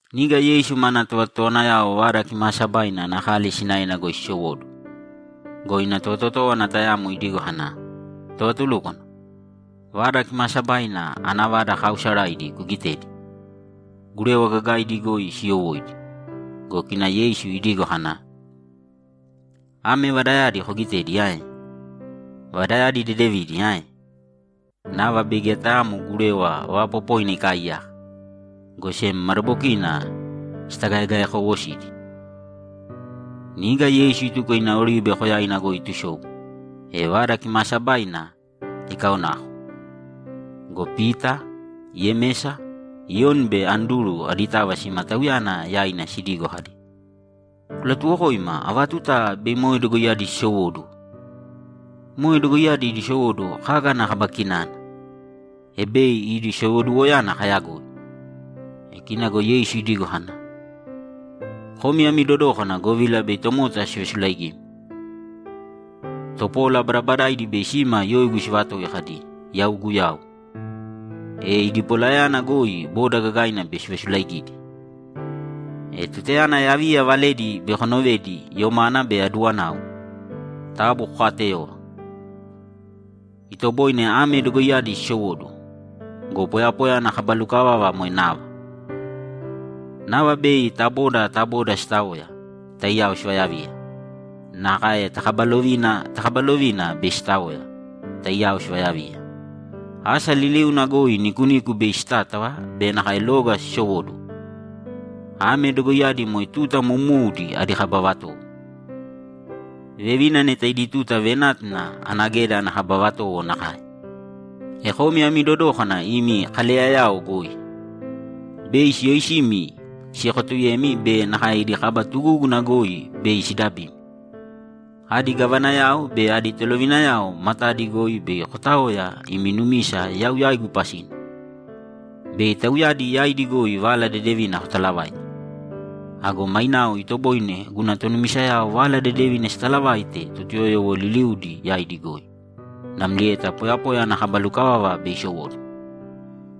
Niga Yeisu mana tovatotowanayao Vada Kimaasabaina ana kali sinaena goi sisowóduwo go, ina tovatotówana tayamo idigo kana, ‘Tovatulúkwana, Vada Kimaasabaina ana vada kaausaraidi kugitēdi; gurewa gagaaidi goi siyowóidi.’ Go kina Yeisu idigo kana, ‘Ame vadayadi kogitedi ae? Vadayadi dedevidi ae? Nava bei geya tayaamo gurewa vaapopoina ikaaiyaka, go sem madabokina sitagaegaekowosidi.’ Niga Yeisu ituko ina Oribe Koyaina goi itusobu, e Vada Kimaasabaina ikaonako go, Pita, Yemesa, Iyoni be Anduru aditava sima Tauyana yaina sidigo kadi, ‘Kulatuwokōima ava tuta bei moe dogoiyadi sisowóduwo? Moe dogoiyadi idi sowóduwo kaga ana kaba kinana, e bei idi sowoduwoyana kayagoi?’ E kina go Yeisu idigo kana, ‘Komi ami dodōkana govila bei tomota sivasulaigimi. Topola badabadaidi bei sima yoigu sivatoi kadi, “Yau Guyau.” E idi polayana goi boda gagaina bei sivasulaigidi. E tutayana yaviya valedi bei konovedi yomana be aduwanau, taabu kokaateyōva. Itoboine ame dogoiyadi sisowóduwo go, poyapoya ana kaba lukavava moe nava. Nava bei ta boda ta boda sitaoya, taiyao sivayaviya. Nakae ta kaba lovina ta kaba lovina bei sitaoya, taiyao sivayaviya. Asa liliuna goi nikuniku bei sitátava be nakae loga sisowóduwo. Ame dogoiyadi moe tuta moumoudi adi kaba vatowo; vevina neta idi tuta venátuna ana geda ana kaba vatowo nakae. E komi ami dodōkana imi kaleyayao goi. Bei siyoisimi siekotuyemi be nakae idi kaba tugúguna goi bei sidabimi. Adi gavanayao be adi tolovinayao matadi goi bei kotaoya imi numisa yau yaigu pasina, bei tauyadi yaidi goi Vala Dedevina kotalavaite. Ago mainao itoboine guna tonumisayao Vala Dedevina sitalavaite Totuyoyowo liliudi yaidi goi, namlieta poyapoya ana kaba lukavava bei isowóduwo.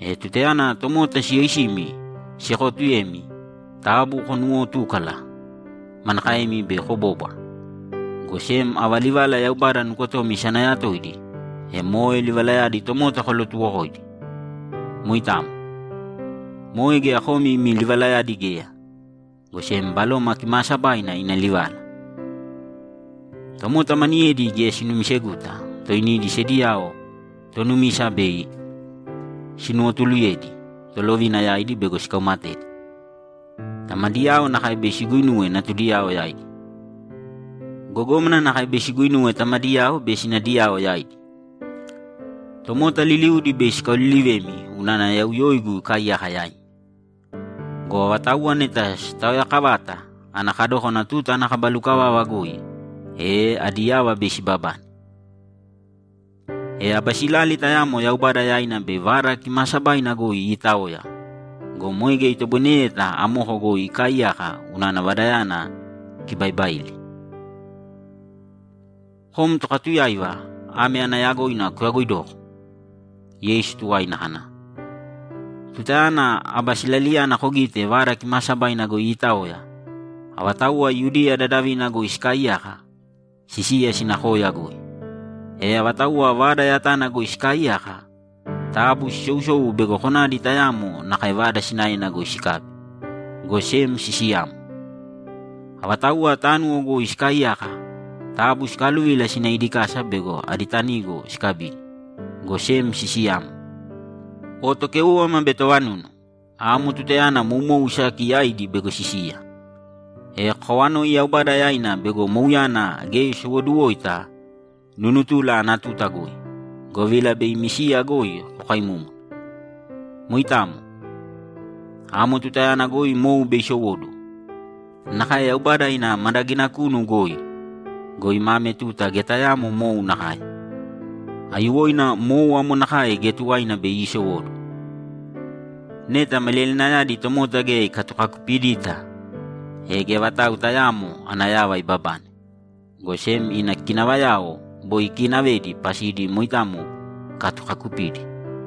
E tutayana tomota siyoisimi siekootuyemi, taabu konuuwotūkala manakaemi bei kobóbwara, go sem ava livalava Yaubada nukotomi isanayatoidi, e moe livalayadi tomota kolatuwokōidi. Moitamo. Moe geya komi imi livalayadi geya, go sem Baloma Kimaasabaina ina livala. Tomota maniyedi geya sinumiseguta toinidi sediyao tonumisa bei sinuwotuluyedi tolovina yaidi bego sikaumatedi. Tamadiyao nakae bei siguinuwe natudiyao yaidi. Gogómana nakae bei siguinuwe tamadiyao be sinadiyao yaidi. Tomota liliudi bei sikaolilivemi unana yau yoigu ikaaiyaka yaimi. Go avatauwa neta sitaoyaakavata ana kadókana tuta ana kaba lukavava goi, e adi yava bei sibabane. E aba silali tayamo Yaubada yaina bei Vada Kimaasabaina goi iitaoya go, moe geya itoboineyeta amoko goi ikaaiyaka unana Vadayana ikibaibaili.’ Kom tokatuyáiva ame ana yagoina kuyagoidōko! Yeisu tuwaina kana, ‘Tutayana aba silaliyana kogite Vada Kimaasabaina goi iitaoya, avatauwa Yudiya dadavina goi sikaaiyaka, sisīya sīna koya goi. E avatauwa vada yatana goi sikaaiyaka, taabu sisousōu bego konadi tayaamo nakae vada sinaena goi sikabi, go sem sisiyāmo. Avatauwa tánuwo goi sikaaiyaka, taabu sikaaluvīla sīna idi kasa bego adi tanigo sikabidi, go sem sisiyāmo. O tokéuwama be tovanunu! Amo tutayana moumou isaki yaidi bego sisiya. E kokawanōi Yaubada yaina bego mouyana geya isowoduwoita nunutula ana tuta goi, govila bei imi siya goi kokaimúmuna. Moitamo. Amo tutayana goi mou bei isowóduwo. Nakae Yaubada ina madagina kunu goi go, ima ame tuta geya tayaamo mou nakae. Aiyuwoina mou amo nakae geya tuwaina bei iisowóduwo. Neta maliyalinayadi Yauwe geya ikatukakupidita, e geya vatau tayaamo ana yava ibabane, go sem ina kinavayao boi ikiinavedi pasidi moitamo ikatukakupidi.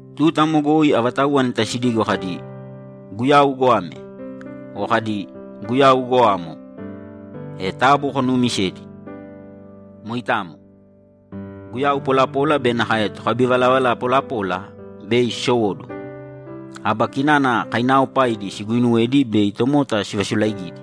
Tuta amo goi avatauwa neta sidigo kadi, “Guyau goame!” o kadi, “Guyau goamo!” e taabu konuumisēdi. Moitamo. Guyau polapola be nakae tokabivalavala polapola bei sisowóduwo, aba kinana kainaaopaidi siguuinuwedi bei tomota sivasulaaigidi.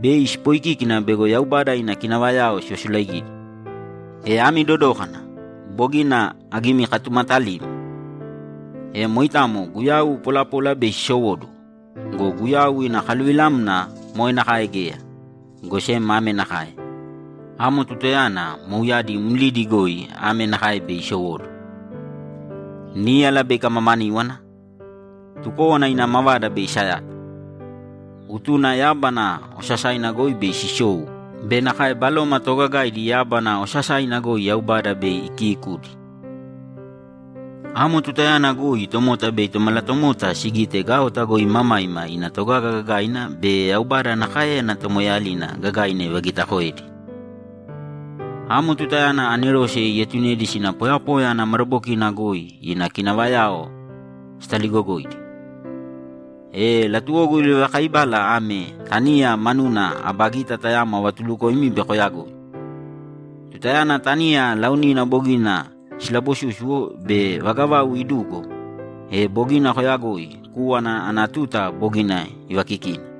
Bei sipoikíkina bego Yaubada ina kinavayao sivasulaigidi. E ami dodōkana! Bogina agimikatumatalimi. E moitamo guyau polapola bei sisowóduwo go, Guyau ina kaluvilamna moe nakae geya, go sem ame nakae: Amo tutayana mouyadi mlidi goi ame nakae bei isowóduwo: Níyala bei ikamamaníwana, tukówana ina mavada bei isayata, utuna yábana osasaina goi bei sisou be nakae baloma toogagaidi yábana osasaina goi Yaubada bei ikiikudi. Amo tutayana goi tomota bei Tomalatomota sigite gaota goi imamaima ina togaga gagaina be Yaubada ana káeyana tomoeeyalina gagaina ivagitakoedi. Amo tutayana anerose bei ietunedi sina poyapoya ana madabokina goi ina kinavayao sitaligogoidi. E latuwogu livalakaibala ame taniya manuna aba gita tayamo avatulukoimi bei koyagoi. Tutayana taniya laonina bogina silabosúsuwo be vaga vau idugo, e bogina koyagoi kúwana ana tuta bogina ivaakikina.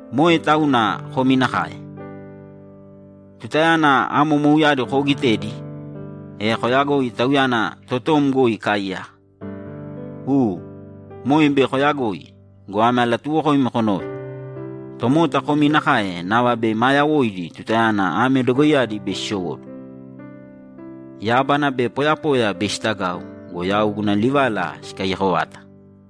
Moe tauna komi nakae. Tutayana amo mouyadi koogitedi, e koyagōi Tauyana totom goi ikaaiyaka. U, moe bei kooyagoi go, ame alatuuwokoimi konōve: Tomota komi nakae nava bei maa yawoidi tutayana ame dogoiyadi bei sisowóduwo. Yábana be poyapoya bei sitagau go, yau guna livala sikaiyako vata.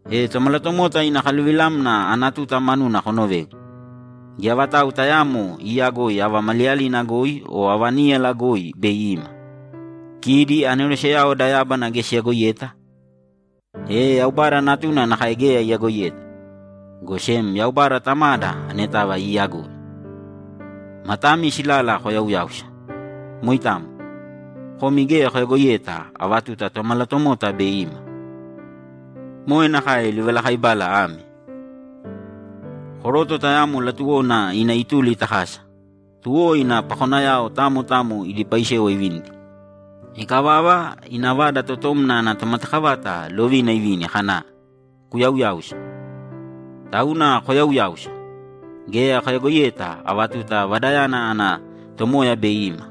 E Tomalatomota ina kaluvilamna ana tuta manuna konovēgu. Geya vatau tayaamo iiyagoi ava maliyalina goi o ava níyala goi bei ima. Kidi anerose da yábana geya siyagoiyeta, e Yaubada Natuna nakae geya iyagoiyeta, go sem Yaubada Tamada anetava iiyagoi. Matami silala koyauyāusa. Moitamo. Komi geya koyagoiyeta ava tuta Tomalatomota bei ima. Moe nakae livalakaibala ame: Koroto tayamo latuwona ina ituli ta kasa. Tuwo ina pakonayao tamo tamo idi paisewa ivinidi. Ikavava, ina vada totomna ana tomatakavata lovina ivini kana, “Kuyauyāusa!” Tauna koyauyāusa! Geya koyagoiyeta ava tuta vadayana ana Tomoya bei ima,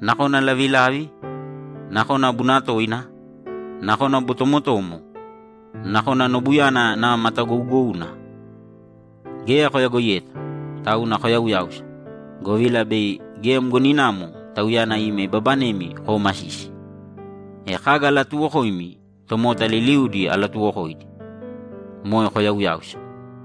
nakona lavilavi, nakona bunatoina, nakona botomotomo, nakona nobuyana nava matagougouna. Geya koyagoiyeta, tauna koyauyāusa, govila bei geya mgoninamo Tauyana ima ibabanemi koomasisi. E kaga alatuuwokoimi, tomota liliudi alatuuwokoidi, moe koyauyāusa.’